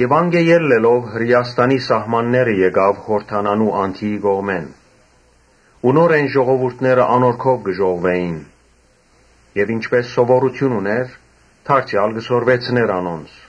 Անկէ ելլելով՝ Հրէաստանի սահմանները գնաց՝ Յորդանանի անդիի կողմէն։ Նորէն ժողովուրդը անոր քով կը ժողվուէին եւ ինչպէս սովորութիւն ունէր, դարձեալ կը սորվեցնէր անոնց։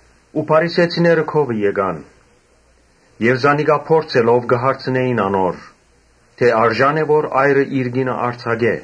Փարիսեցիները քովը եկան եւ զանիկա փորձելով՝ կը հարցնէին անոր թէ «Արժա՞ն է որ այրը իր կինը արձակէ»։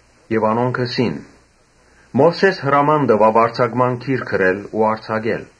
Անոնք ըսին. «Մովսէս հրաման տուաւ արձակման գիր գրել ու արձակել»։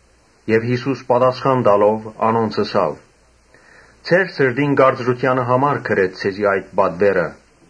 Յիսուս պատասխան տալով՝ անոնց ըսաւ. «Ձեր սրտին կարծրութեանը համար գրեց ձեզի այդ պատուէրը.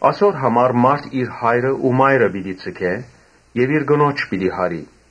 «Ասոր համար մարդ իր հայրը ու մայրը պիտի ձգէ եւ իր կնոջ պիտի յարի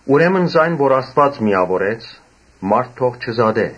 Ուրեմն զայն որ Աստուած միաւորեց, մարդ թող չզատէ»։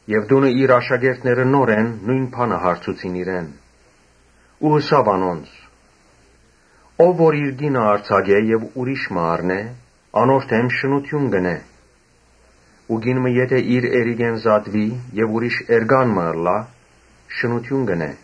Եւ տունը իր աշակերտները նորէն նոյն բանը հարցուցին իրեն։ Ըսաւ անոնց. «Ով որ իր կինը արձակէ եւ ուրիշ մը առնէ, անոր դէմ շնութիւն կ’ընէ։ Ու կին մը եթէ իր էրիկէն զատուի եւ ուրիշ էրիկ մը առնէ, շնութիւն կ’ընէ»։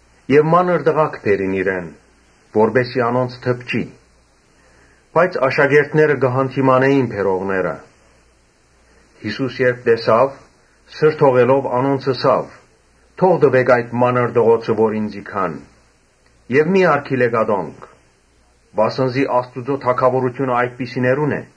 Մանր տղաք բերին իրեն. որպէս զի անոնց դպչի, բայց աշակերտները կը յանդիմանէին բերողները։ Յիսուս երբ տեսաւ, սրդողելով անոնց ըսաւ. «Թող տուէք այդ մանր տղոցը, որ ինծի գան եւ մի՛ արգիլէք ատոնք, վասն զի Աստուծոյ թագաւորութիւնը այդպիսիներունն է։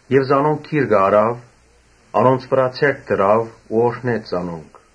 Եւ զանոնք գիրկը առաւ, անոնց վրայ ձեռք դրաւ ու օրհնեց զանոնք։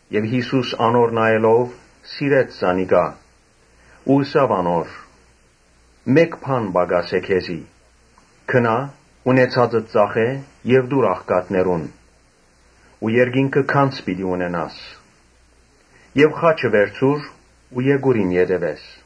Յիսուս անոր նայելով՝ սիրեց զանիկա ու ըսաւ անոր. «Մէկ բան պակաս է քեզի. գնա՛, ունեցածդ ծախէ՛, տո՛ւր աղքատներուն ու երկինքը գանձ պիտի ունենաս եւ խաչը վերցուր ու եկուր իմ ետեւէս»։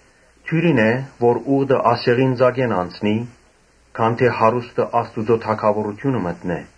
Դիւրին է որ ուղտը ասեղին ծակէն անցնի, քան թէ հարուստը Աստուծոյ թագաւորութիւնը մտնէ»։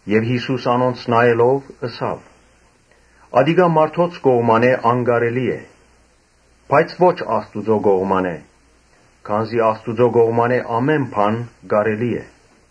Յիսուս անոնց նայելով՝ ըսաւ. «Ատիկա մարդոց կողմէ անկարելի է, բայց ո՛չ Աստուծոյ կողմէ. քանզի Աստուծոյ կողմէն ամէն բան կարելի է»։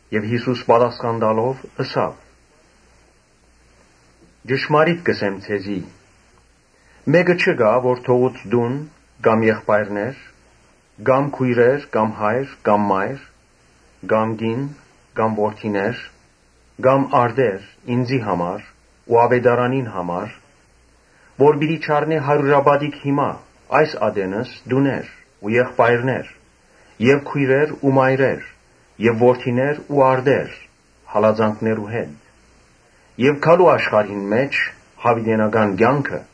Յիսուս պատասխան տալով՝ ըսաւ. «Ճշմարիտ կ’ըսեմ ձեզի, ‘Մէկը չկայ որ թողուց տուն, կամ եղբայրներ, կամ քոյրեր, կամ հայր, կամ մայր, կամ կին, կամ որդիներ, կամ արտեր՝ ինծի ու աւետարանին համար, Որ պիտի չառնէ հարիւրապատիկ հիմա՝ այս ատենս տուներ ու եղբայրներ եւ քոյրեր ու մայրեր եւ որդիներ ու արտեր հալածանքներու հետ եւ գալու աշխարհին մէջ՝ յաւիտենական կեանքը’։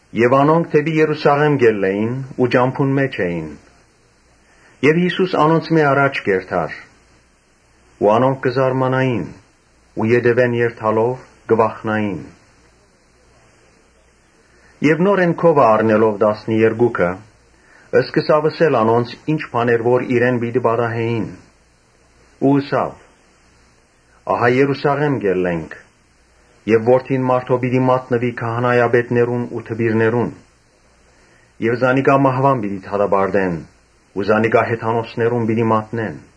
Երբ անոնք դէպի Երուսաղէմ կ’ելլէին ու ճամբուն մէջ էին, Յիսուս անոնցմէ առաջ կ’երթար։ Անոնք կը զարմանային ու ետեւէն երթալով՝ կը վախնային։ Նորէն քովը առնելով տասներկուքը, սկսաւ թուել անոնց՝ ինչ բաներ որ իրեն պիտի պատահէին. Ու ըսաւ. «Ահա Երուսաղէմէն կ’ելլենք եւ Որդին մարդոյ պիտի մատնուի քահանայապետներուն ու դպիրներուն եւ զանիկա մահուան պիտի դատապարտեն ու զանիկա հեթանոսներուն պիտի մատնեն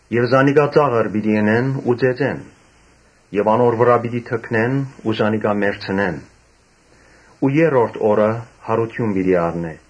Եւ զանիկա ծաղր պիտի ընեն ու ծեծեն եւ անոր վրայ պիտի թքնեն ու զանիկա մեռցնեն, բայց երրորդ օրը յարութիւն պիտի առնէ»։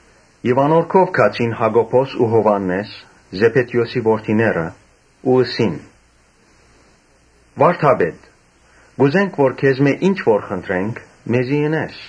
Ապա անոր քով գացին Յակոբոսն ու Յովհաննէսը՝ Զեբեդէոսի որդիները՝ ու ըսին. «Վա՛րդապետ, կ’ուզենք որ քեզմէ ինչ որ խնդրենք՝ մեզի ընես»։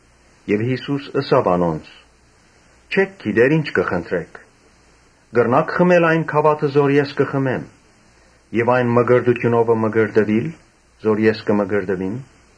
Յիսուս ըսաւ անոնց. «Չէք գիտեր ի՛նչ կը խնդրէք։ Կրնա՞ք խմել այն գաւաթը որ ես կը խմեմ եւ այն մկրտութիւնովը մկրտուիլ՝ որով ես կը մկրտուիմ»։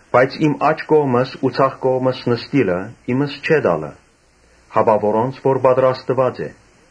Բայց իմ աջ կողմս ու ձախ կողմս նստիլը՝ իմս չէ տալը, հապա որոնց որ պատրաստուած է»։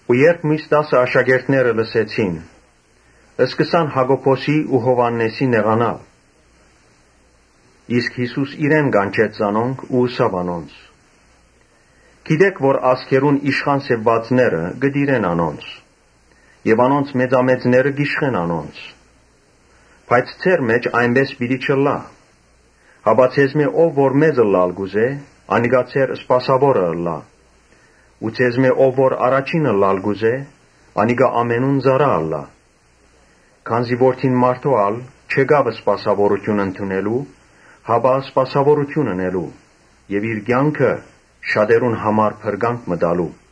Ու երբ միւս տասը աշակերտները լսեցին, սկսան Յակոբոսին ու Յովհաննէսին նեղանալ։ Իսկ Յիսուս իրեն կանչեց զանոնք ու ըսաւ անոնց. «Գիտէք թէ ազգերուն իշխան սեպուածները կը տիրեն անոնց եւ անոնց մեծամեծները կ’իշխեն անոնց. Բայց ձեր մէջ այնպէս պէտք չէ ըլլայ, հապա ձեզմէ ով որ մեծ ըլլալ կ’ուզէ, անիկա ձեր սպասաւորը պէտք է ըլլայ. Ու ձեզմէ ով որ առաջին ըլլալ կ’ուզէ, անիկա ամենուն ծառայ պէտք է ըլլայ։ Քանզի Որդին մարդոյ չեկաւ սպասաւորութիւն ընդունելու, հապա սպասաւորութիւն ընելու եւ իր կեանքը շատերուն համար իբր փրկանք տալու»։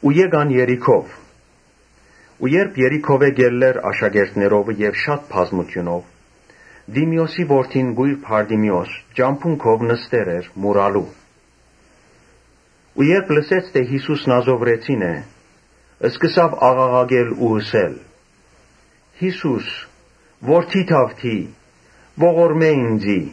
Եկան Երիքով։ Երբ Երիքովէն կ’ելլէր աշակերտներովը եւ շատ բազմութիւնով, Տիմէոսի որդին կոյր Բարտիմէոս ճամբուն քով նստեր էր մուրալու։ Երբ լսեց թէ Յիսուս Նազովրեցին է, սկսաւ աղաղակել ու ըսել. «Յիսո՛ւս, որդի՛ Դաւթի, ողորմէ՛ ինծի»։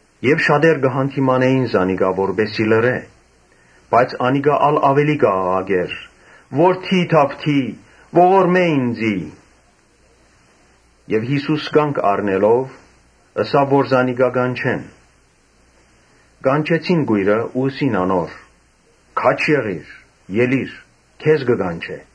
Շատեր կը յանդիմանէին զանիկա, որպէս զի լռէ։ Բայց անիկա ա՛լ աւելի կ’աղաղակէր. «Որդի՛ Դաւիթի, ողորմէ ինծի»։ Յիսուս կանգ առնելով՝ ըսաւ որ զանիկա կանչեն։ Կանչեցին կոյրը ու ըսին անոր. «Քա՛ջ եղիր, ելի՛ր, քեզ կը կանչէ»։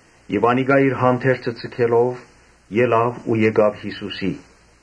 Անիկա իր հանդերձը ձգելով, ելաւ ու եկաւ Յիսուսին։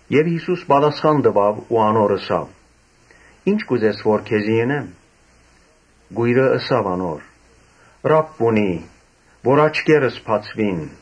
Եւ Յիսուս ըսաւ անոր. «Ի՞նչ կ’ուզես որ քեզի ընեմ» Կոյրը ըսաւ. «Ռաբբունի, կ’ուզեմ որ աչքերս բացուին»։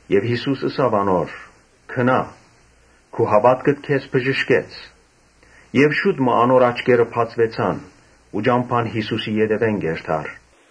Եւ Յիսուս ըսաւ անոր. «Գնա՛. քու հաւատքդ քեզ բժշկեց»։ Եւ շուտ մը անոր աչքերը բացուեցան ու ճամբան Յիսուսին ետեւէն կ’երթար։